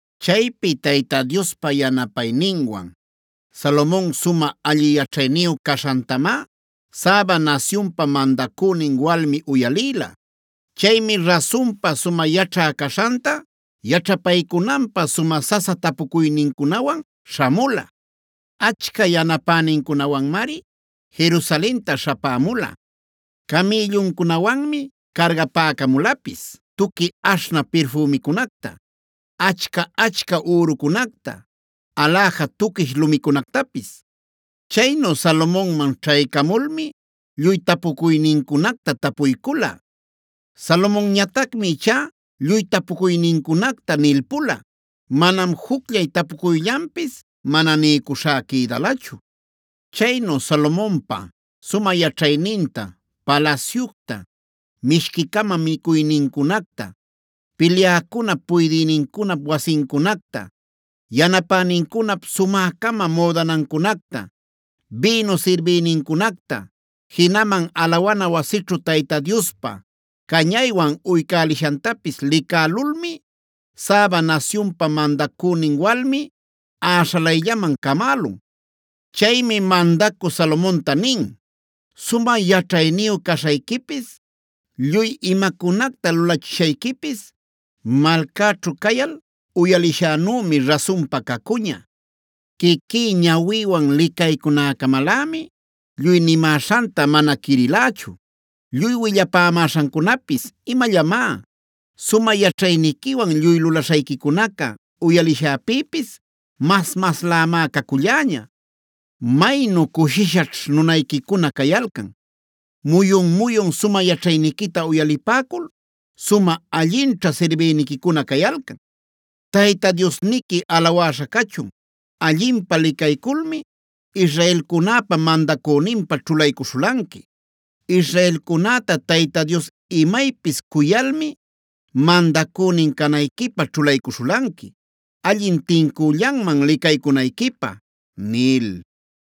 Chaypi Tayta Diospa yanapayninwan, Salomon sumä alli yaćhayniyu caśhantamá Saba nasyunpa mandacünin walmi uyalïla. Chaymi rasunpa sumä yaćhä caśhanta yaćhapaycunanpä sumä sasa tapucuynincunawan śhamula. Achca yanapänincunawanmari Jerusalenta śhapämula. Camïlluncunawanmi cargapäcamulapis tuqui aśhnä pirfümicunacta, achca-achca ürucunacta, aläja tuquish lumicunactapis. Chaynu Salomonman ćhaycamulmi lluy tapucuynincunacta tapuycula. Salomonñatacmi ichá lluy tapucuynincunacta nilpula. Manam jucllay tapucuyllanpis mana niycuśhá quïdalachu. Chaynu Salomonpa sumä yaćhayninta, palasyucta, mishqui-cama micuynincunacta, pilyäcunap puydïnincunap wasincunacta, yanapänincunap sumä-cama müdanancunacta, bïnu sirbïnincunacta, jinaman alawana wasićhu Tayta Diospä cañaywan uycälishantapis licälulmi Saba nasyunpa mandacünin walmi äśhalayllaman camälun. Chaymi mandacü Salomonta nin: “Sumä yaćhayniyu caśhayquipis, lluy imacunacta lulachishayquipis malcäćhu cayal uyalishänümi rasunpa cacuña. Quiquí ñawïwan licaycunäcamalämi lluy nimäśhanta mana quirilächu. Lluy willapämäśhancunapis imallamá. Sumä yaćhayniquiwan lluy lulaśhayquicunaca uyalishäpïpis mas-maslämá caculläña. ¡Maynu cushishaćh nunayquicuna cayalcan! ¡Muyun-muyun sumä yaćhayniquita uyalipäcul sumä allinćha sirbïniquicuna cayalcan! ¡Tayta Diosniqui alawäśha cachun! Allinpä licayculmi israelcunäpa mandacüninpä ćhulaycuśhulanqui. Israelcunäta Tayta Dios imaypis cuyalmi mandacünin canayquipä ćhulaycuśhulanqui, allin tincüllanman licaycunayquipä” nil.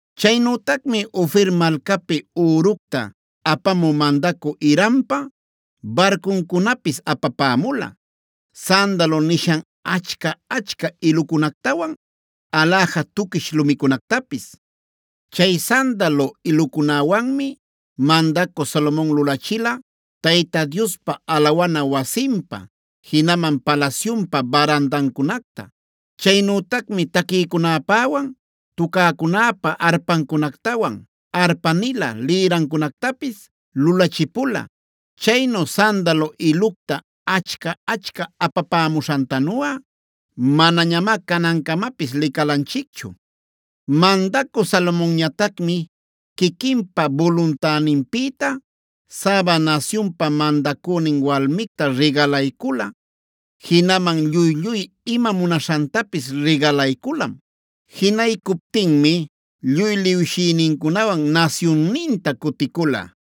Chaynütacmi Ofira malcapi üructa apamu mandacü Hirampa barcuncunapis apapämula, sandalo nishan achca-achca ilucunactawan aläja tuquish lumicunactapis. Chay sandalo ilucunäwanmi mandacü Salomon lulachila Tayta Diospa alawana wasinpä, jinaman palasyunpä barandancunacta. Chaynütacmi taquïcunäpäwan tucäcunäpa arpancunactawan arpanila lïrancunactapis lulachipula. Chaynu sandalo ilucta achca-achca apapämuśhantanuꞌa manañamá canancamapis licalanchicchu. Mandacü Salomonñatacmi quiquinpa buluntäninpïta Saba nasyunpa mandacünin walmicta rigalaycula. Jinaman lluy-lluy ima munaśhantapis rigalayculam. Jinaycuptinmi lluy liwshïnincunawan nasyunninta cuticula.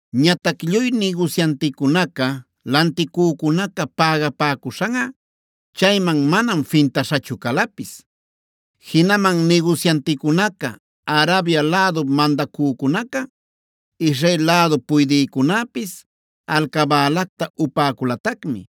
Ñatac lluy nigusyanticunaca, lanticücunaca pägapäcuśhanꞌa chayman manam fintaśhachu calapis. Jinaman nigusyanticunaca, Arabia lädup mandacücunaca, Israel lädu puydïcunäpis alcabälacta upäculatacmi.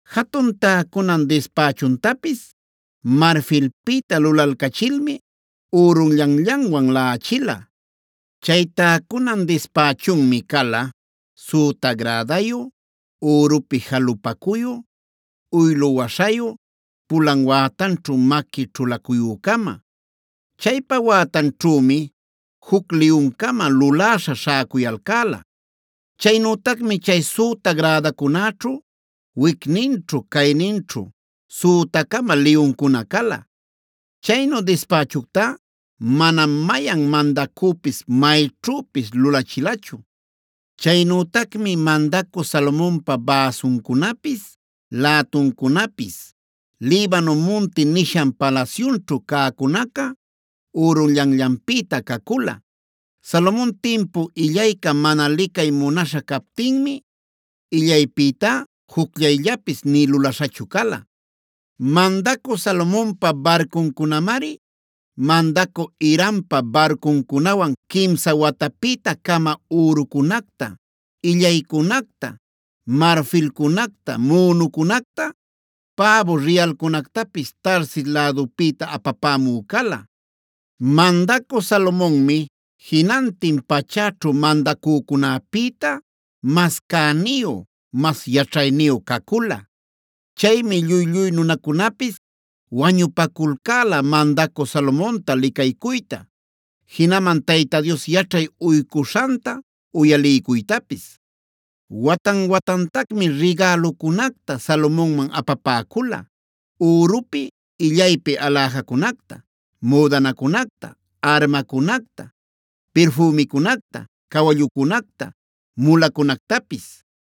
Jatun täcunan dispächuntapis marfilpïta lulalcachilmi ürunllanllanwan laꞌachila. Chay täcunan dispächunmi cala: süta gradayu, ürupi jalupacuyu, uylu waśhayu, pulan wätanćhu maqui ćhulacuyü-cama. Chaypa wätanćhümi juc liyun-cama luläśha śhäcuyalcäla. Chaynütacmi chay süta grädacunäćhu wicninćhu cayninćhu süta-cama liyuncuna cala. Chaynu dispächuctá manam mayan mandacüpis mayćhüpis lulachilachu. Chaynütacmi mandacü Salomonpa bäsuncunapis, lätuncunapis “Libano munti” nishan palasyunćhu cäcunaca ürunllanllanpïta cacula. Salomon timpu illayca mana licay munaśha captinmi, illaypïtá jucllayllapis nï lulaśhachu cala. Mandacü Salomonpa barcuncunamari, mandacü Hirampa barcuncunawan quimsa watapïta-cama ürucunacta, illaycunacta, marfilcunacta, münucunacta, päbu riyalcunactapis Tarsis lädupïta apapämü cala. Mandacü Salomonmi jinantin pachäćhu mandacücunäpïta mas cäniyu, mas yaćhayniyu cacula. Chaymi lluy-lluy nunacunapis wañupaculcäla mandacü Salomonta licaycuyta, jinaman Tayta Dios yaćhay uycuśhanta uyaliycuytapis. Watan-watantacmi rigälucunacta Salomonman apapäcula: ürupi illaypi aläjacunacta, müdanacunacta, armacunacta, pirfümicunacta, cawallucunacta, mulacunactapis.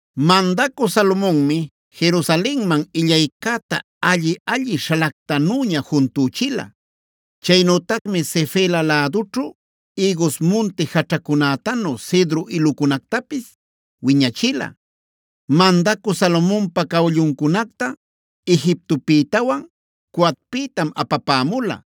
Mandacü Salomonmi Jerusalenman illaycäta alli-alli śhalactanüña juntüchila.d Chaynütacmi Sefela lädućhu ïgus munti jaćhacunätanu cedro ilucunactapis wiñachila. Mandacü Salomonpa cawalluncunacta Egiptopïtawan Coapïtam apapämula.